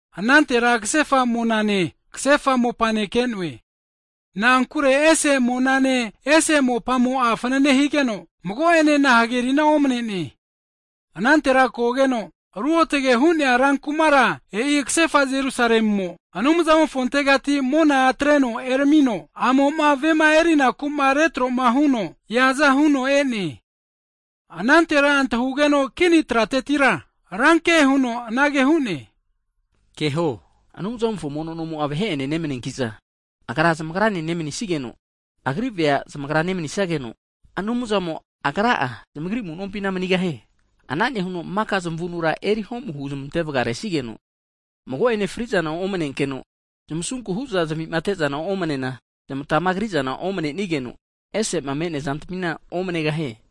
Anantera kasefa monane, kasefa mopane ke'noe, na'ankure ese monane, ese mopamo'a fnane higeno, mago'enena hagerina omne'ne. Anantera kogeno Ruotge hu'nea rankumara e'i kasefa Jerusalemo, Anumzamofontegati mona atreno eramino, a'mo'ma vema erinaku'ma retro'ma huno eaza huno e'ne. Anantera antahugeno kini tratetira, ranke huno anage hu'ne, keho, Anumzamofo mono nomo'a vahe'ene nemaniankiza, Agra zamagrane nemanisigeno, Agri vea zmagra nemanisageno, Anumzamo Agra'a zamagri amu'nompina manigahie. Ana nehuno maka zmavunura eri homu huzmante vgaresigeno, mago'ene fri'zana omnenkeno, zmasunku huza zavima atezana omnena, zmatama krizana omnenigeno, ese'ma me'nea zantamina omnegahie.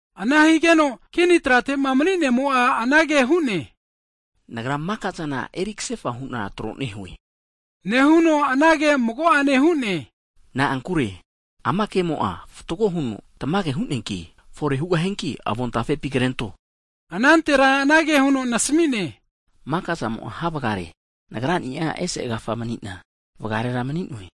Ana higeno kini tratema mni'nemo'a anage hu'ne, Nagra maka'zana eri kasefa hu'na tro nehue. Nehuno anage mago'ane hu'ne, na'ankure ama kemo'a fatgo huno tamage hu'neanki, fore hugahianki avontafepi krento. Anantera anage huno nasamine, maka zamo'a havgare, Nagrani'a (Alfa) ese agafahu mni'na, (Omega) vgarera mni'noe,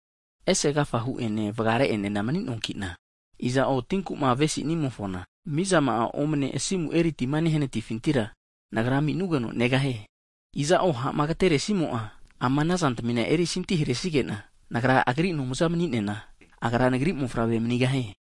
ese agafahu ene vgare'enena mni'noankina, iza'o tinku'ma avesinimofona, mizama'a omne asimu eri tima nehanatifintira Nagra ami'nugeno negahie. Iza'o ha'ma agateresimo'a ama anazantamina erisanti haresigena Nagra agri Anumza mni'nena, agra Nagri mofavre manigahie.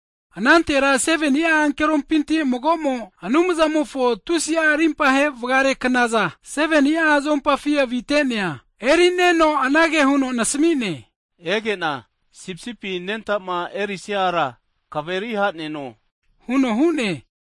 Anantera 7ni'a ankeropinti magomo Anumzamofo tusi'a rimpahe vgare knazana 7ni'a zuompafi avite'nea erineno anage huno nasamine, ege'na Sipisipi anentama erisia ara kaveri haneno huno hu'ne.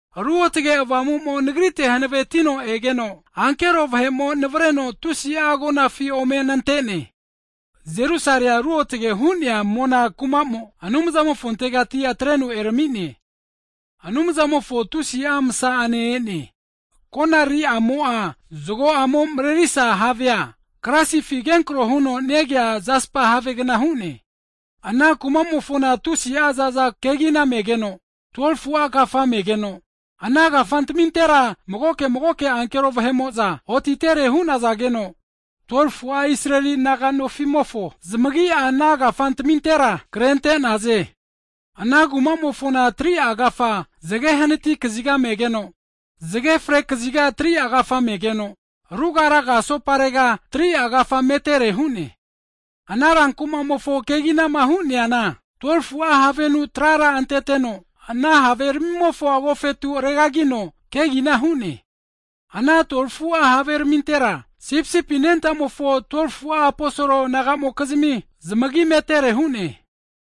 Ruotge Avamumo nagrite hanavetino egeno, ankero vahe'mo navreno tusi'a agonafi ome nante'ne. Jerusalea ruotge hu'nea mona kumamo Anumzamofontegati atreno erami'ne. Anumzamofo tusi'a msamo ana kumara remsa higeno. konariri'amo'a, zgo'amo mrerisa havegna higeno, klasifi kenkro huno negea Jaspa havegna hu'ne. Ana kumamofona tusi'a zaza kegina megeno, 12fu'a kafa megeno, ana kafantamintera magoke magoke ankero vahe'mo'za otitere hu'nazageno, 12fu'a Israeli naga'nofimofo zmagi'a ana kafantamintera krente'naze. Ana kumamofona 3'a kafa, zge hanati kaziga megeno, zge fre kaziga 3'a kafa megeno, ruga raga asoparega 3'a kafa metere hu'ne. Ana rankumamofo keginama hu'neana, 12fu'a havenu trara anteteno, ana haveramimofo agofetu regrino kegina hu'ne. Ana 12fu'a haveramintera, Sipisipi anentamofo 12fu'a aposol nagamokizmi zmagi metere hu'ne.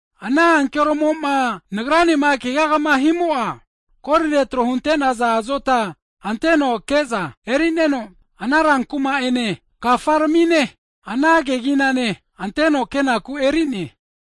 Ana ankeromoma nagranema keagama himo'a, kolire tro hunte'naza azota anteno ke'za (mesarim) erineno, ana rankuma ene, kafantamine ana keginane anteno kenaku eri'ne.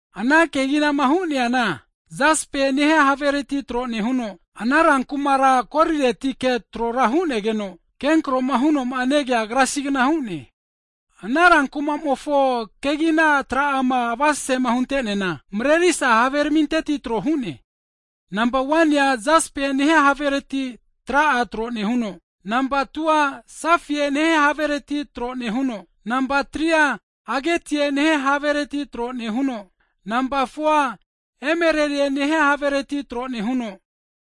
Ana keginama huneana, Jaspae nehia havereti tro nehuno, ana rankumara koliretike trora hu'negeno, kenkro hunoma negea klasigna hu'ne. Ana rankumamofo kegina tra'ama avasesema hunteneana, mrerisa haveraminteti tro hu'ne. Nampa 1nia jaspe nehia havereti tra'a tro nehuno, nampa 2a safie nehia havereti tro nehuno, nampa 3a agetie nehie havereti tro nehuno, nampa 4a emelelie nehia havereti tro nehuno,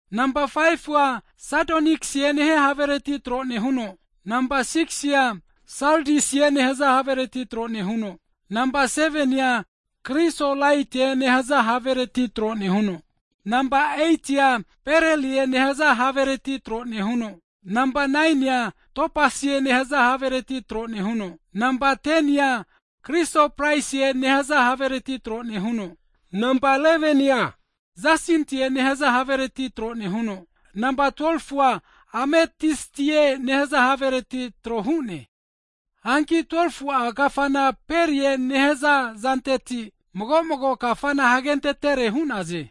nampa 5fu'a sadoniksie nehia havereti tro nehuno, nampa 6si'a saldiusie nehaza havereti tro nehuno, nampa 7nia krisolaetie nehaza havereti tro nehuno, nampa 8tia berlelie nehaza havereti tro nehuno, nampa 9nia topasie nehaza havereti tro nehuno, nampa 10nia krisoprasie nehaza havereti tro nehuno, nampa 11nia jasintie nehaza havereti tro nehuno, nampa 12fu'a ametistie nehaza havereti tro hu'ne. Hanki 12fu'a kafana perie nehaza zanteti mago mago kafana hagentetere hu'naze.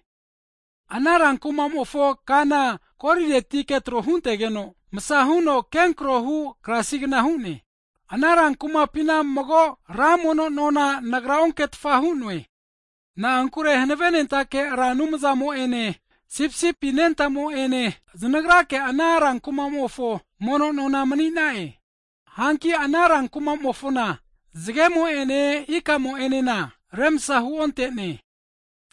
Ana rankumamofo kana koliretike tro huntegeno, msa huno kenkro hu klasigna hu'ne. Ana rankumapina mago ra mono nona nagra onketfa hu'noe. Na'ankure Hanavenentake Ra Anumzamo'ene, Sipisipi anentamo'ene znagrake ana rankumofo mono nona mni'na'e. Hanki ana rankumamofona zgemo ene ikamo'enena remsa huontene.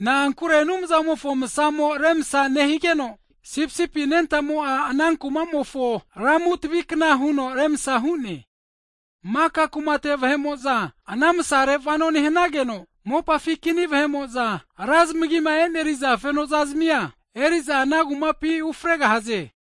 Na'ankure Anumzamofo msamo remsa nehigeno, Sipisipi anentamo'a ana kumamofo lamu tavikna huno remsa hu'ne. Maka kumate vahe'mo'za ana msare vano nehanageno, mopafi kini vahe'mo'za, ra zamagima e'neriza fenoza zmia eri'za ana kumapi ufregahaze.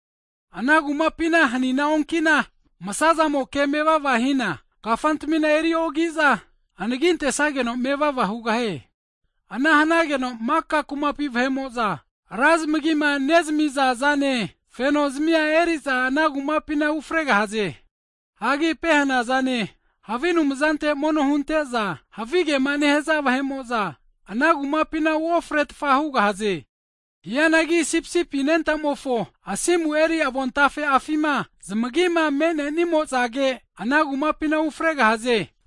Ana kumapina hanina onkina msa zamoke mevava hina, kafantamina eriogiza anagintesageno mevava hugahie. Ana hanageno maka kumapi vahe'mo'za, ra zmagima nezamiza zane feno zazmia eriza ana kumapina ufregahaze. Hagi pehena zane, havi anumzante mono hunente'za, havigema nehaza vahe'mo'za, ana kumapina uofretfa hugahaze. Hianagi Sipisipi anentamofo asimu eri avontafe'afima, zmagima me'nenimo'zage ana kumapina ufregahaze.